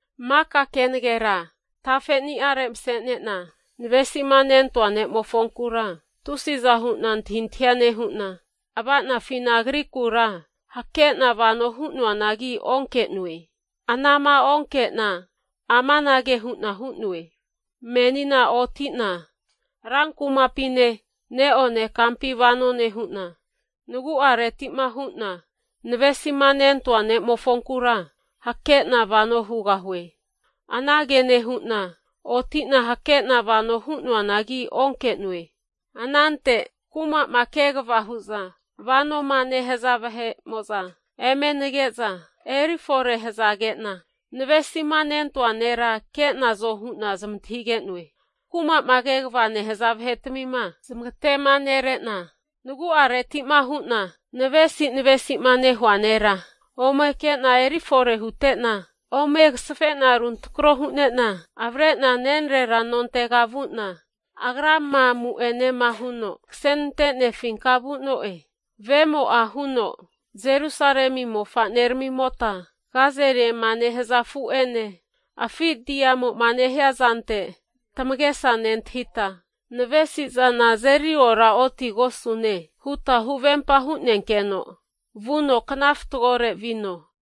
Maka kenagera tafeni'are mase'nena, navesima nentoa ne'mofonkura tusiza hu'na antahintahia nehu'na, ava'nafina agrikura hakena vano hu'noanagi onke'noe. Anama onke'na amanage hu'na hu'noe, menina oti'na rankumapine neone kampi vano nehu'na, nagu'aretima hu'na navesima nentoa ne'mofonkura hakena vano hugahue. Anage nehu'na otina hakena vano hu'noanagi onke'noe. Anante kumama kegava hu'za vanoma nehaza vahe'mo'za eme nage'za eri fore hazage'na, navesima nentoa nera ke'nazo hu'na zamantahige'noe. Kuma'ma kegavama nehaza vahetmima zamagate'ma nere'na, nagu'areti'ma hu'na navesi navesima nehua nera ome ke'na erifore hutena, ome agazafe'na anukinena avre'na nenrera nontega vu'na agrama amu'enema huno kasenante'nefinka vu'noe. Vemo'a huno, Jerusalemi mofaneramimota gazeliema nehaza afu'ene, afi diamo'ma nehia zante tamagesa nentahita, navesizana azeri ora otigosune huta huvempa hunenkeno vuno kna fatgore vino.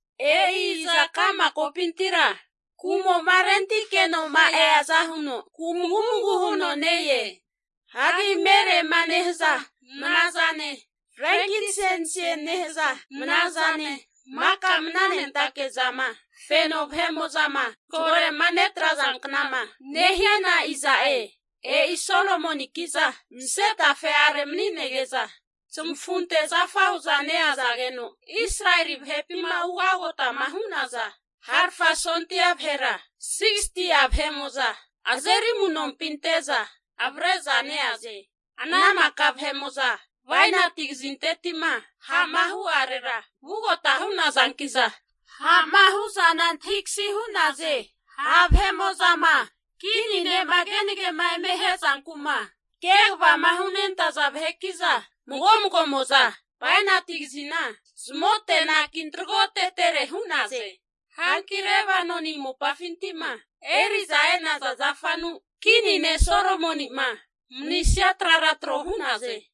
E'i iza ka'ma kopintira kumo'ma rentikenoma eaza huno kumagumagu huno ne-e? Hagi merema nehaza mna zane, frenkinsensie nehaza mna zane maka mnanentake zama feno vahe'mo'zama zagore'ma netrazankna'ma nehiana iza'e? E'i Solomoninki'za, mase tafe'are mani'nege'za zamafunte zafa hu'za neazageno Israeli vahepima ugagotama hu'naza harafa sondia vahera, 60'a vahe'mo'za azeri amu'nompi ante'za avre'za neaze. Ana maka vahe'mo'za bainati kazinteti'ma ha'ma hu'arera vugota hunazanki'za, ha'ma hu'zana antahikasi'naze. Ha' vahe'mo'zama kini ne'ma kenage'ma eme ahe'zanku'ma kegava hunentaza vaheki'za mago magomo'za bainati kazina zamote anaki tragotetere hu'naze. Hanki Lebanoni mopafinti'ma eri'za e'naza zafanu kini ne' Solomoni'ma manisia trara tro hu'naze.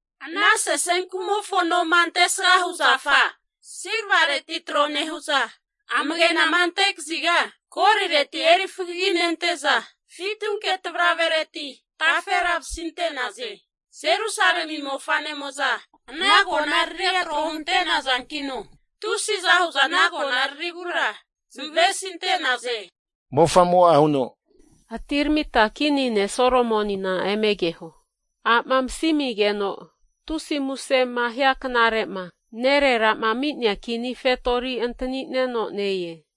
Ana sesenkumofo noma antesgama hu zafa Silvareti tro nehu'za, amagenama ante kaziga golireti eri fagaginente'za, fitunke tavravereti tafera masinte'naze. Jerusalemi mofanemo'za ana konararia tro huntenazankino, tusiza hu'za ana konararigura zamavesinte'naze. Atiramita kini ne' Solomonina eme keho. A'ma masimigeno tusi musema hia knare'ma, nerera'ma ami'nea kini fetori antanino ne-e.